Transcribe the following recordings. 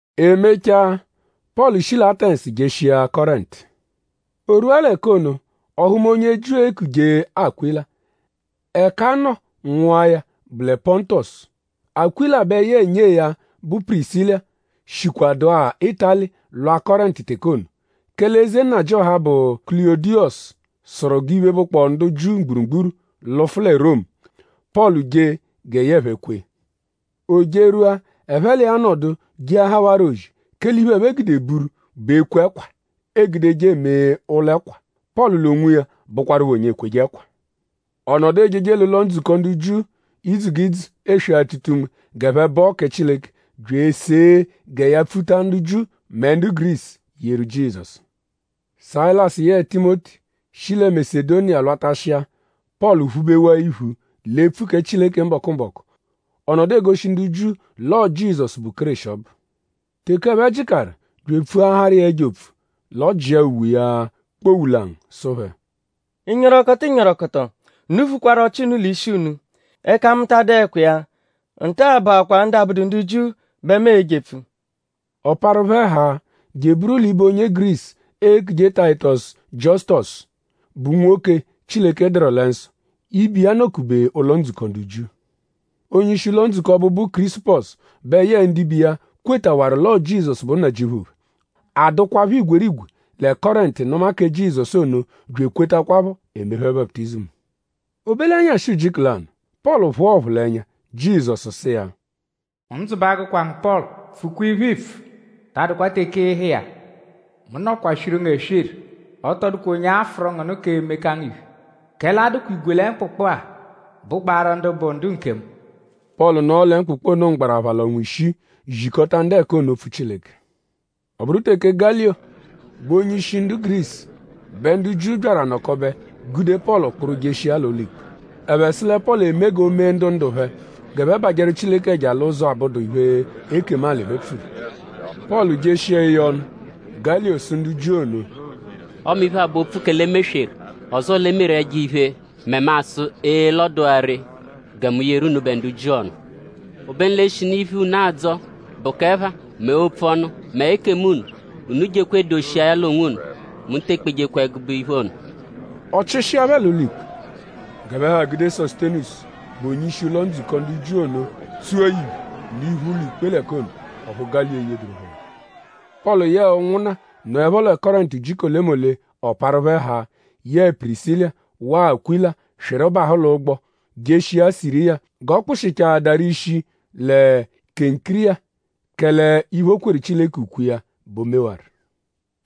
E mechaa; Pọlu shi lẹ Atẹnsu jeshia Kọrentu. O rwua l'ẹka ono; ọ hụma onye Jiu, eekuje Akwịla. Ẹka a nọ nwụa ya bụ lẹ Pọntosu. Akwịla bẹ yẹe nyee ya bụ Pirisila shikwadụa Ịtali lwa Kọrentu teke ono; kẹle eze nnajịoha, bụ Kulọdiyosu sụru g'iphe, bụkpoo ndu Jiu mgburugburu lụfu lẹ Romu. Pọlu jee gẹ yẹe phẹ kwee. O jerwua; ẹphe l'iya nọdu jeahawarọ ozi; kẹle iphe, ẹphe gude buru bụ ekwe ẹkwa, eegudeje eme ụlo-ẹkwa. Pọlu l'onwiya bụkwapho onye ekweje ẹkwa. Ọ nọdu ejeje l'ụlo-ndzukọ ndu Jiu idzu g'idzu eswe-atụta-unme g'ẹphe bọo kẹ Chileke; bya esee gẹ ya pfuta ndu Jiu mẹ ndu Gurisu yeru Jizọsu. Sayilasu yẹe Timoti shi lẹ Masedoniya lwatashịa; Pọlu phubewaa iphu l'epfu kẹ Chileke mbọku-mbọku. Ọ nọdu egoshi ndu Jiu l'ọo Jizọsu, bụ Kéreshi ọbu. Teke ẹphe jịkaru bya epfuaharụ iya ẹjo opfu; l'ọ jịa uwe iya kpowulangu sụ phẹ: “Ịnyorokoto ịnyorokoto! Unu vukwaru ọchi unu l'ishi unu. Ẹka mu ta adụekwa iya. Nta-a bụakwaa ndu abụdu ndu Jiu bẹ mu e-jepfu.” Ọ parụ phẹ haa je eburu l'ibe onye Gurisu, eekuje Tayitọsu Jiọsutosu, bụ nwoke, Chileke dụru lẹ nsọ. Ibe iya nọ-kube ụlo-ndzukọ ndu Jiu. Onye-ishi ụlo-ndzukọ ọbu, bụ Kirisupọsu bẹ yẹe ndibe iya kwetawaru l'ọo Jizọsu bụ Nnajịuphu phẹ. A dụkwapho igwerigwe lẹ Kọrentu nụma kẹ Jizọsu ono bya ekwetakwaphọ; e mee phẹ baputizimu. O be l'ẹnyashi ujiku lanụ; Pọlu phụa ọphulenya. Jizọsu sụ iya: “Ndzụ ba agụkwa ngu Pọlu! Pfukwa iphe, iipfu; ta adụkwa teke ịiha iya. Mu nọkwaa swiru ngu eswiru. Ọ tọ dụkwa onye a-fụru ngu nụ k'emeka ngu iphe; kẹle a dụkwa igwe lẹ mkpụkpu-a bụgbaaru ndu bụ ndu nkemu.” Pọlu nọo lẹ mkpụkpu ono mgbarapha l'ọnwa ishii zikọta ndu ẹka ono opfu Chileke. Ọ bụru teke Galiyo bụ onye-ishi ndu Gurisu bẹ ndu Jiu byaru anọkobe gude Pọlu kpụru jeshia l'ụlo-ikpe. Ẹphe sụ lẹ Pọlu eme g'o mee ndu ndu-phẹ g'ẹphe bajẹru Chileke ẹja l'ụzo, abụdu iphe, ekemu alị phẹ pfuru. Pọlu jeshia eye ọnu; Galiyo sụ ndu Jiu ono: “Ọme iphe-a bụ opfu kẹ l'e mesweru; ọzoo l'e meru ẹjo-iphe mẹ mu asụ ee l'ọ dụ-a ree gẹ mu yeru unubẹ ndu Jiu ọnu. Obenu l'eshinu iphe, unu adzọ bụ k'ẹpha mẹ opfu ọnu; mẹ ekemu unu; unu jekwa edoshia ya l'onwunu. Mu te ekpejekwa ẹgube iphe ono.” Ọ chịshia phẹ l'ụlo-ikpe. G'ẹphe ha gude Sosutenisu, bụ onye-ishi ụlo-ndzukọ ndu Jiu ono tsua ya iphe l'iphu ụlo-ikpe l'ẹka ono. Ọphu Galiyo eyeduru phẹ ọnu. Pọlu yẹe ụnwunna nọepho lẹ Kọrentu ujiku olemole; ọ parụ phẹ haa; yẹe Pirisila waa Akwịla swịru bahụ l'ụgbo jeshia Siriya g'ọ kpụshichaadaru ishi lẹ Kenkiriya; kẹle iphe, o kweru Chileke ukwe iya bẹ o mewaru.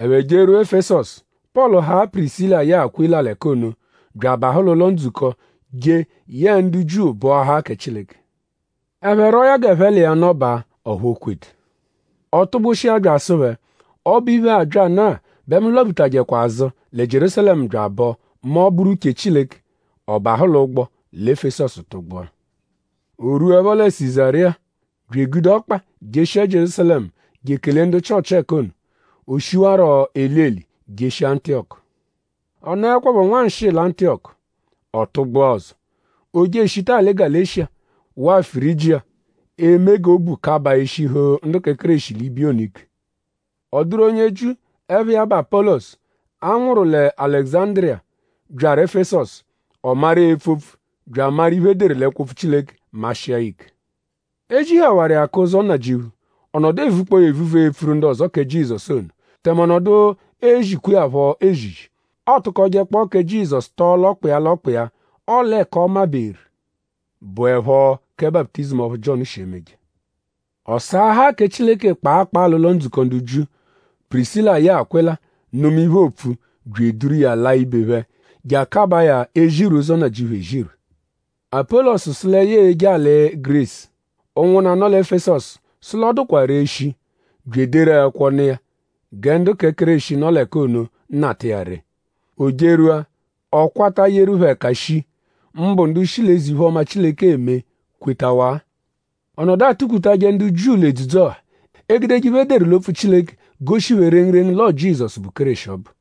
Ẹphe jerwua Efesọsu. Pọlu haa Pirisila yẹe Akwịla l'ẹka ono bya abahụ l'ụlo-ndzukọ je yẹe ndu Jiu bọahaa kẹ Chileke. Ẹphe rwọo ya g'ẹphe l'iya nọbaa; ọphu o kwedu. Ọ tụgbushia bya asụ phẹ: Ọbo-iphe-a abyanụ-a bẹ mu lwaphutajẹkwa azụ lẹ Jierúsalẹmu bya abọ mẹ ọ -bụru uche Chileke. Ọ bahụ l'ụgbo lẹ Efesọsu tụgbua. O -rwuẹpho lẹ Sizariya; bya egude ọkpa jeshia Jierúsalẹmu je ekele ndu Chịochi ẹka ono. O shiwarọ eli-eli jeshia Antiyọku. Ọ nọekwapho nwanshịi lẹ Antiyọku; ọ tụgbua ọzo. O je eshita alị Galeshiya waa Firijiya eme g'obu kabaa eshihu ndu kẹ Kéreshi l'ibiya ono ike. Ọ dụru onye Jiu, ẹpha iya bụ Apọlosu, a nwụru lẹ Alẹguzandiriya, byaru Efesọsu. Ọ maru epfu opfu bya amaru iphe, e deru l'ẹkwo-opfu Chileke mashịa ya ike. E zihawaru iya k'ụzo Nnajịuphu; ọ nọdu evukpọo ya evuvu epfuru ndu ọzo kẹ Jizọsu ono; tẹme ọ nọdu ezikwa iya phọ ezizi. Ọotukojekpo kẹ Jizọsu tọo l'ọkpa iya l'ọkpa iya; ọle ẹka ọ maberu bụepho kẹ baputizimu ọphu Jiọnu shi emeje. Ọ saahaa kẹ Chileke kpaa kpaa l'ụlo-ndzukọ ndu Jiu. Pirisila yẹe Akwịla nụma iphe, oopfu bya eduru iya laa ibe phẹ; je akabaa ya ezirwe ụzo Nnajịuphu ezirwe. Apọlosu sụ lẹ ya e-je alị Gurisu. Ụnwunna, nọ lẹ Efesọsu sụ l'ọ dụkwa ree shii; bya ederu ẹkwo nụ iya gẹ ndu kẹ Kéreshi, nọ l'ẹka ono nata iya ree. O jerwua; ọ kwata yeru phẹ ẹka shii; mbụ ndu shi l'eze-iphe-ọma, Chileke eme kwetawaa. Ọ nọdu atụ-kputajẹ ndu Jiu l'edzudzu-ọha; egudeje iphe, e deru l'opfu Chileke goshi phẹ rengurengu l'ọo Jizọsu, bụ Kéreshi ọbu.